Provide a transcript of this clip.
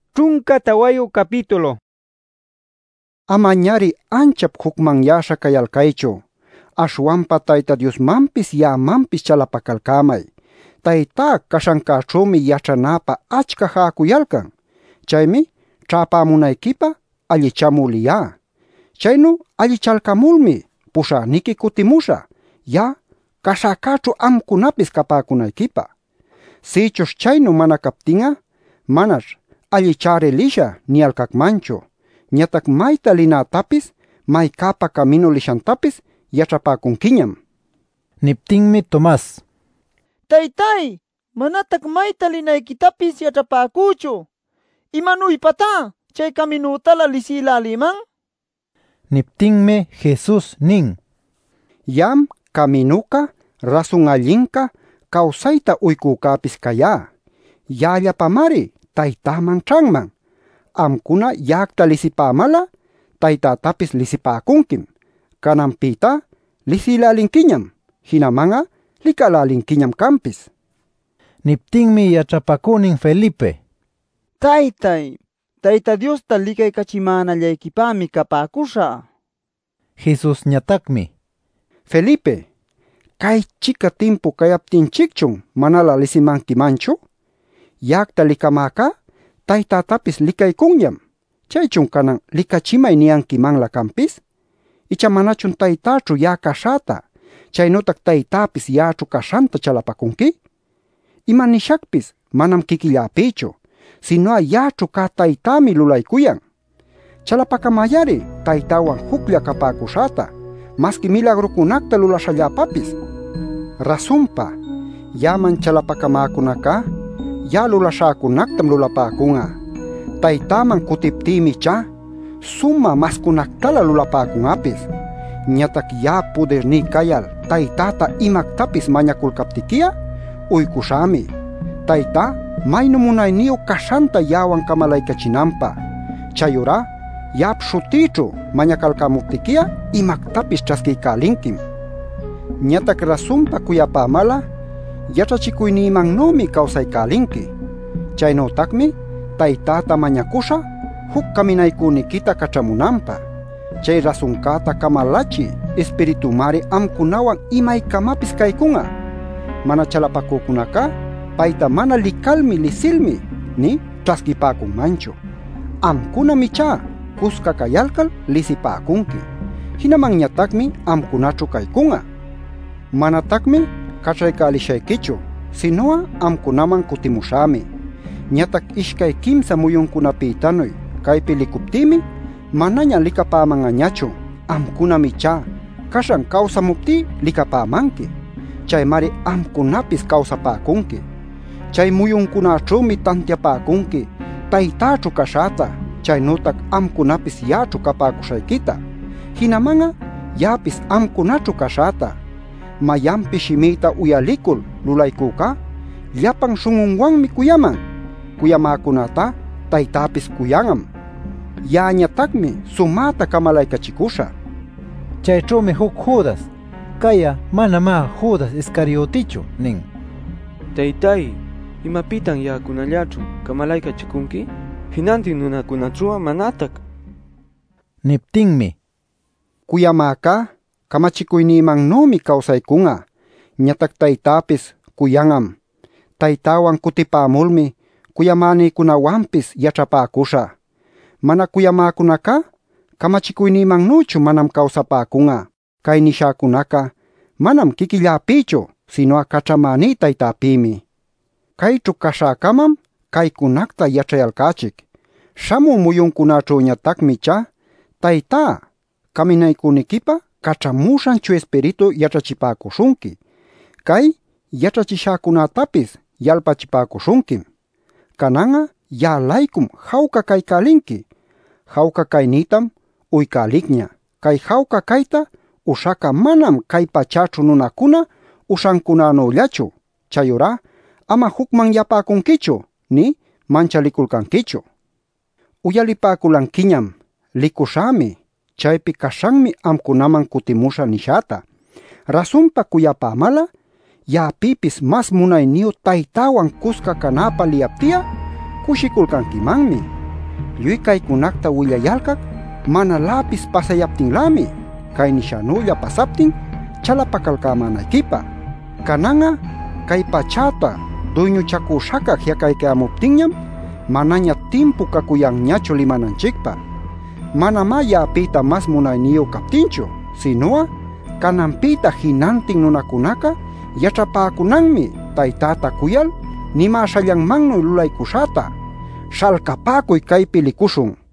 Nishanpïmi: “Amañari anchap jucmanyäśha cayalcaychu. Aśhwanpa Tayta Diosmanpis, ya'amanpis chalapacalcämay. Taytá caśhancäćhümi yaćhanapä achca jäcuyalcan. Chaymi ćhäpämunayquipä allichamü liyá. Chaynu allichalcamulmi puśhäniqui cutimuśhä, ya'a caśhäcäćhu amcunapis capäcunayquipä. Sïchuśh chaynu mana captin'a manaćh ‘Allichä-ari lishä’ niyalcacmanchu. Ñatac mayta linätapis, maycäpa caminu lishantapis yaćhapäcunquiñam” nin. Niptinmi Tomas: “Taytay, manatac mayta linayquitapis yaćhapäcüchu. ¿Imanuypatá chay caminütälä lisïlälïman?” nin. Niptinmi Jesus nin: “Ya'am caminuca, rasun allinca, cawsayta uycücäpis cayá. Ya'allapamari Taytäman ćhanman. Amcuna ya'acta lisipämal'a Taytätapis lisipäcunquim. Cananpïtá lisïlälinquiñam. Jinaman'a licälälinquiñam canpis” nil. Niptinmi yaćhapacünin Felipe: “Taytay, Tayta Diosta licaycachimänallayquipämi capäcuśhä” nin. Jesusñatacmi: “Felipe, ¿cay-chica timpu cayaptinchicchun manalä lisimanquimanchu? Ya'acta licamäcá, Taytätapis licaycunñam. ¿Chaychun canan ‘licachimay’ niyämanquimanlä canpis? Icha ¿manachun Taytäćhu ya'a caśhäta chaynütac Taytäpis ya'aćhu caśhanta chalapacunqui? Imanishacpis manam quiquilläpïchu, sinu'a ya'aćhu cä Taytämi lulaycuyan. Chalapacamay-ari Taytäwan juclla capäcuśhäta masqui milagrucunacta lulaśhalläpapis. Rasunpa, ya'aman chalapacamäcunacá ya'a lulaśhäcunactam lulapäcun'a. Taytäman cutiptïmi ichá sumä mascunactalä lulapäcun'apis. Ñatac ya'ap pudirní cayal Taytäta imactapis mañaculcaptiqui'a uycuśhämi, Taytá maynu munayniyu caśhanta ya'awan camalaycachinanpä. Chayurá ya'ap śhutïćhu mañacalcämuptiqui'a imactapis ćhasquiycälinquim. “Ñatac rasunpa cuyapämal'a, yaćhachicuynïmannümi cawsaycälinqui. Chaynütacmi Taytäta mañacuśhä juc Caminaycüniquita caćhamunanpä. Chay rasuncäta camalachï Ispiritunmari amcunawan imaycamapis caycun'a. Mana chalapacücunacá payta mana licalmi lisilmi nï ćhasquïpäcunmanchu. Amcunam ichá cusca cayalcal lisipäcunqui. Jinamanñatacmi amcunaćhu caycun'a. Manatacmi caćhaycälishayquichu, sinu'a amcunaman cutimuśhämi. Ñatac ishcay quimsa muyuncunapïtanuy caypi licuptïmi manaña licapäman'añachu. Amcunam ichá caśhan cawsamuptí licapämanqui. Chaymari amcunapis cawsapäcunqui. Chay muyuncunaćhümi tantiapäcunqui Taytäćhu caśhäta, chaynütac amcunapis ya'aćhu capäcuśhayquita, jinaman'a ya'apis amcunaćhu caśhäta. Mayanpis shimïta uyalicul lulaycücá llapan śhun'unwanmi cuyaman. Cuyamäcunätá Taytäpis cuyan'am. Ya'añatacmi sumäta camalaycachicuśhä” nin. Chayćhümi juc Judas — cay'a manamá Judas Iscariotichu — nin: “Taytay, ¿imapïtan ya'acunallaćhu camalaycachicunqui, jinantin nunacunaćhu'a manatac?” nil. Niptinmi: “Cuyamäcá camachicuynïmannümi cawsaycun'a ñatac Taytäpis cuyan'am. Taytäwan cutipämulmi cuyamänïcunawanpis yaćhapäcuśhä. Mana cuyamäcunacá camachicuynïmannüchu manam cawsapäcun'a. Cay nishäcunaca manam quiquilläpïchu sinu'a caćhamäní Taytäpïmi. Cayćhu caśhäcamam caycunacta yaćhayalcächic. Śhamü muyuncunaćhüñatacmi ichá Taytá Caminaycüniquipä caćhamuśhan Chuya Ispiritu yaćhachipäcuśhunqui. Cay yaćhachishäcunätapis yalpachipäcuśhunquim. “Canan'a ya'a-laycum jawca caycälinqui. Jawca caynïtam uycälicña. Cay jawca cayta uśhac'a manam cay pachäćhu nunacuna uśhancänüllachu. Chayurá ama jucmanyapäcunquichu, nï manchaliculcanquichu. Uyalipäculanquiñam ‘Licuśhämi; chaypi caśhanmi amcunaman cutimuśhä’ nishäta. Rasunpa cuyapämal'a ya'apïpis mas munayniyu Taytäwan cusca canäpä liyapti'a cushiculcanquimanmi. Lluy caycunacta willayalcac manaläpis pasayaptinlämi, cay nishänülla pasaptin chalapacalcämänayquipä. “Canan'a cay pachäta duyñuchacüśhaca ji'acaycayämuptinñam manaña timpu cacuyanñachu limananchicpä. Manamá ya'apïta mas munayniyu captinchu, sinu'a cananpïta jinantin nunacunaca yaćhapäcunanmi Taytäta cuyal nimäśhallanmannuy lulaycuśhäta. ¡Śhalcapäcuy, caypi licuśhun!” nin.